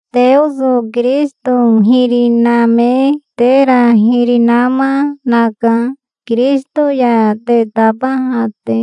Teoso Kirisito hiri name tera hiri nama naka, Kirisito ya te tabaha te.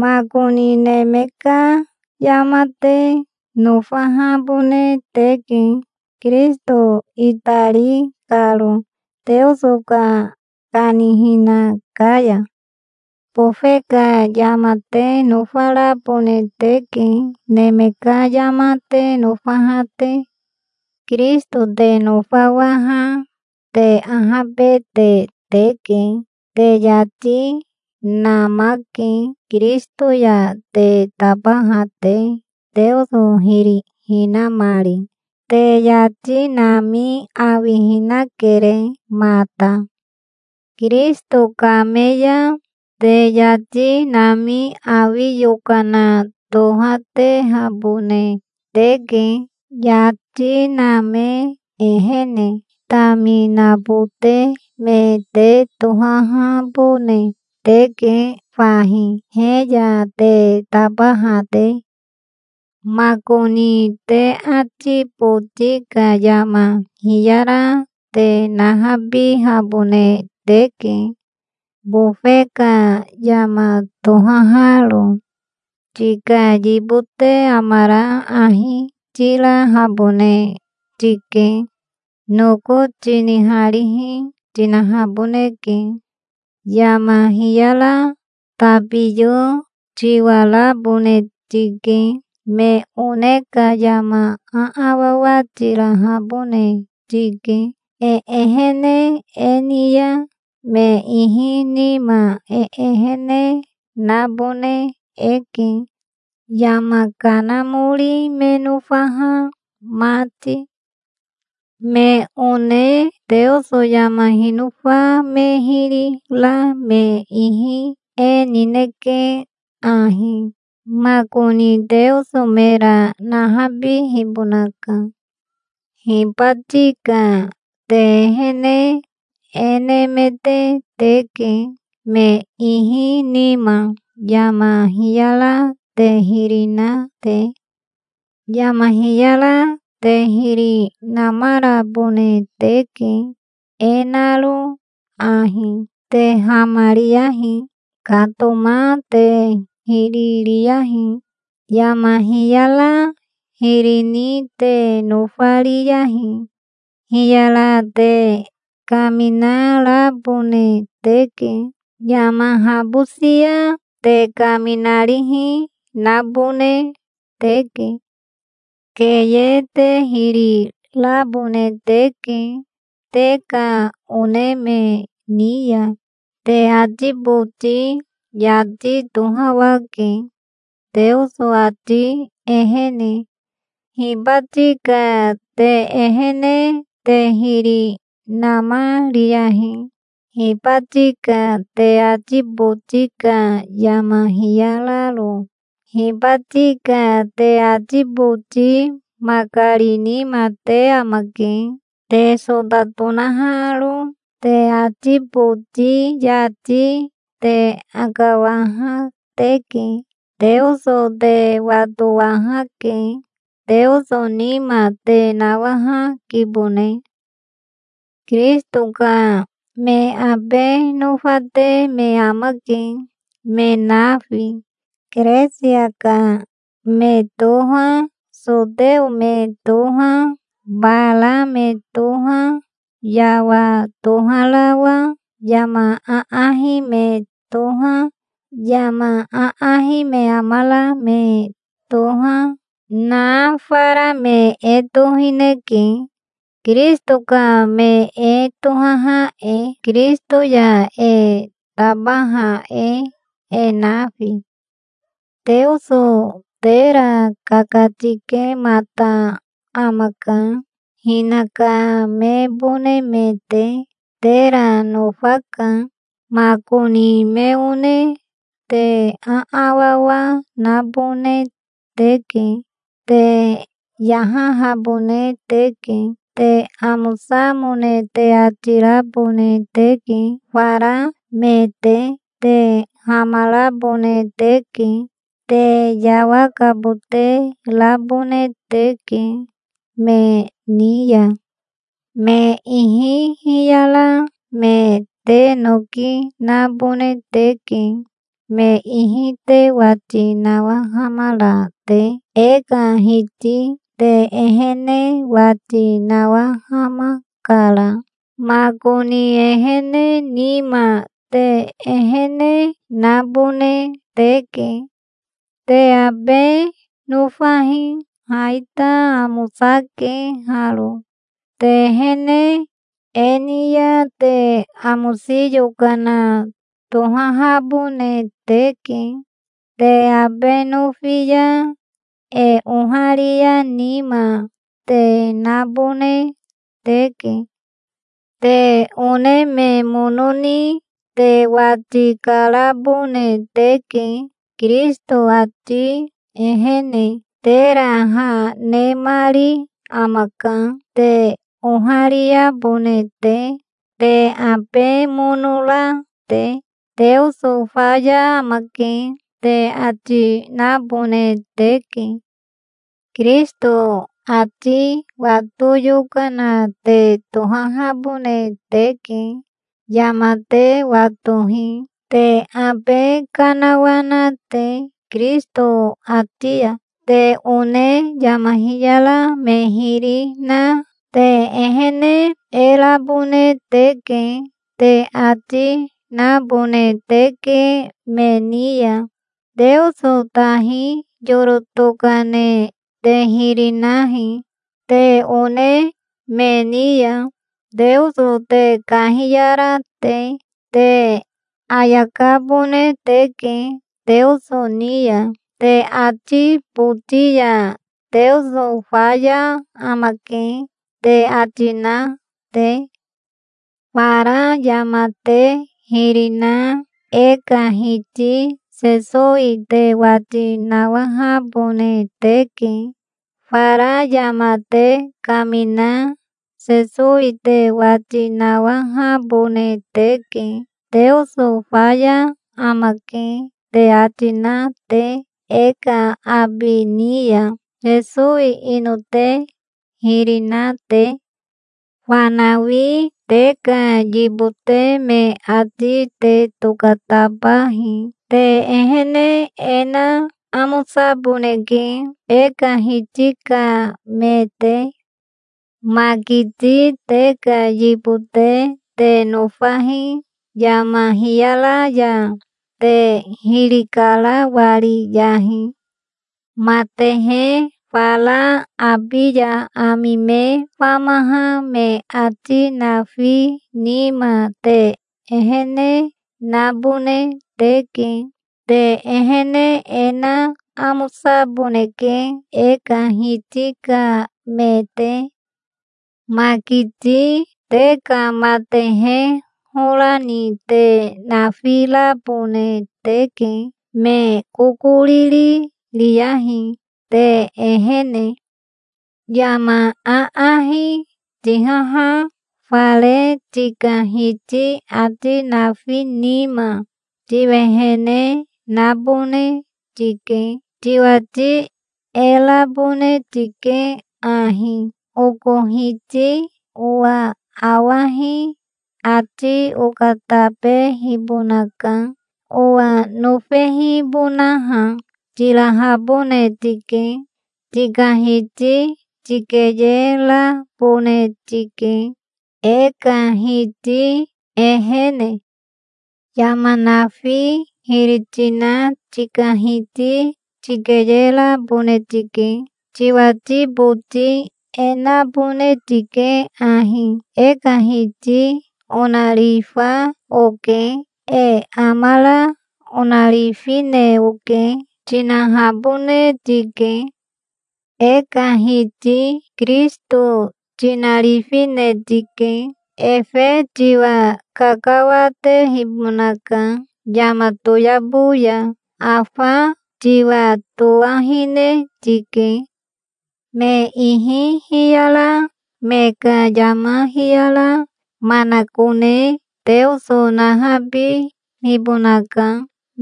Makoni neme ka yama te nofahabone teke, Kirisito itari karo, Teoso ka kanihina ka ya. Bofe ka yama te nofarabone teke, neme ka yama te nofaha te. Kirisito te nofawaha te ahabete teke. Te yati namake, Kirisito ya te tabaha te, Teoso hiri hinamari. Te yati nami awihinakere mata. Kirisito kame ya te yati nami awi yokana tohatehabone teke, yati name ehene. Taminabote me te tohahabone teke fahi, he ya te tabaha te. Makoni te ati boti ka yama hiyara te nahabihabone teke, bofe ka yama tohaharo. Tika yibote amara ahi tirahabone tike. Noko tiniharihi tinahaboneke. Yama hiyara tabiyo tiwarabone tike. Me one ka yama aawawa tirahabone tike. E ehene e ni ya me ihi nima e ehene nabone eke, yama kanamori me nofaha mati. Me one Teoso yama hinofa me hiri ra me ihi e nineke ahi. Makoni Teoso mera nahabihibonaka. Hibati ka te ehene e nemete teke, me ihi nima, yama hiyara te hiri na te. Yama hiyara te hiri namarabone teke, e naro ahi: te hamariyahi. Katoma te hiri riyahi. Yama hiyara hiri ni te nofariyahi. Hiyara te kaminarabone teke. Yama habosia te kaminarihi nabone teke. Keye te hiri rabone teke te ka one me ni ya. Te ati boti yati tohawake, Teoso ati ehene. Hibati ka te ehene te hiri namariyahi, hibati ka te ati boti ka yama hiyararo. Hibati ka te ati boti makari nima te amake te sota tonaharo. Te ati boti yati te akawaha teke. Teoso te watowahake. Teoso nima te nawahakibone. Kirisito ka me abe nofate me amake, me nafi. Keresia ka me toha, soteo me toha, bara me toha, yawa toharawa, yama aahi me toha, yama aahi me amara me toha, na fara me e tohineke Kirisito ka me e tohaha e, Kirisito ya e tabaha e, e nafi. Teoso tera kakatikemata amaka, hinaka mebone me te. Tera nofaka. Makoni me one te aawawa nabone teke. Te yahahabone teke. Te amosamone te ati rabone teke fara me te. Te hamarabone teke. Te yawakabote rabone teke me ni ya. Me ihi hiyara me te noki nabone teke, me ihi te wati nawahamara te. E ka Hiti te ehene wati nawahamakara. Makoni ehene nima te ehene nabone teke. Te abe nofahi. Ha ita amosake haro. Te ehene e ni ya te amosi yokana tohahabone teke. Te abe nofi ya e oharia nima te nabone teke. Te one me mono ni te wati karabone teke, Kirisito ati ehene. Tera ha nemari amaka, te ohariabone te, te abe mono ra te. "Teoso faya amake", te ati nabone teke. Kirisito ati wato yokana te tohahabone teke. Yama te watohi, te abe kanawana te Kirisito ati ya. Te one yama hiyara me hiri na, "Te ehene e rabone teke", te ati nabone teke me ni ya. Teoso tahi yoro tokane te hiri nahi te one me ni ya, Teoso te kahiyara te. Te ayakabone teke Teoso ni ya, te ati boti ya, "Teoso faya amake", te ati na te. Fara yama te hiri na e ka Hiti Sesowi te wati nawahabone teke. Fara yama te kamina Sesowi te wati nawahabone teke, "Teoso faya amake", te ati na te e ka abi ni ya, Sesowi ino te hiri na te. Fanawi te ka yibote me ati te tokatabahi. Te ehene e na amosaboneke, e ka Hiti ka me te. Makiti te ka yibote te nofahi. Yama hiyara ya te hiri karawariyahi. Matehe fara abi ya ami me famaha me ati nafi nima te ehene nabone teke. Te ehene e na amosaboneke, e ka Hiti ka me te. Makiti te ka matehe hora ni te nafirabone teke. Me kokoriri riyahi te ehene. Yama aahi tihaha fare tika hiti ati nafi nima tiwehene nabone tike. Tiwati e rabone tike ahi: "Oko hiti owa awahi ati okatabehibonaka, owa nofehibonaha", tirahabone tike. Tika hiti tikeyerabone tike, e ka Hiti ehene. Yama nafi hiri tina tika hiti tikeyerabone tike. Tiwati boti e nabone tike ahi: "E ka Hiti onarifa oke. E amara onarifine oke", tinahabone tike. E ka Hiti Kirisito tinarifine tike. Efe tiwa kakawatehibonaka yama toyabo ya. Afa tiwatowahine tike. Me ihi hiyara me ka yama hiyara manakone Teoso nahabihibonaka,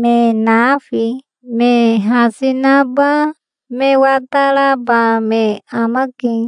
me nafi. Me hasi naba me wataraba me amake.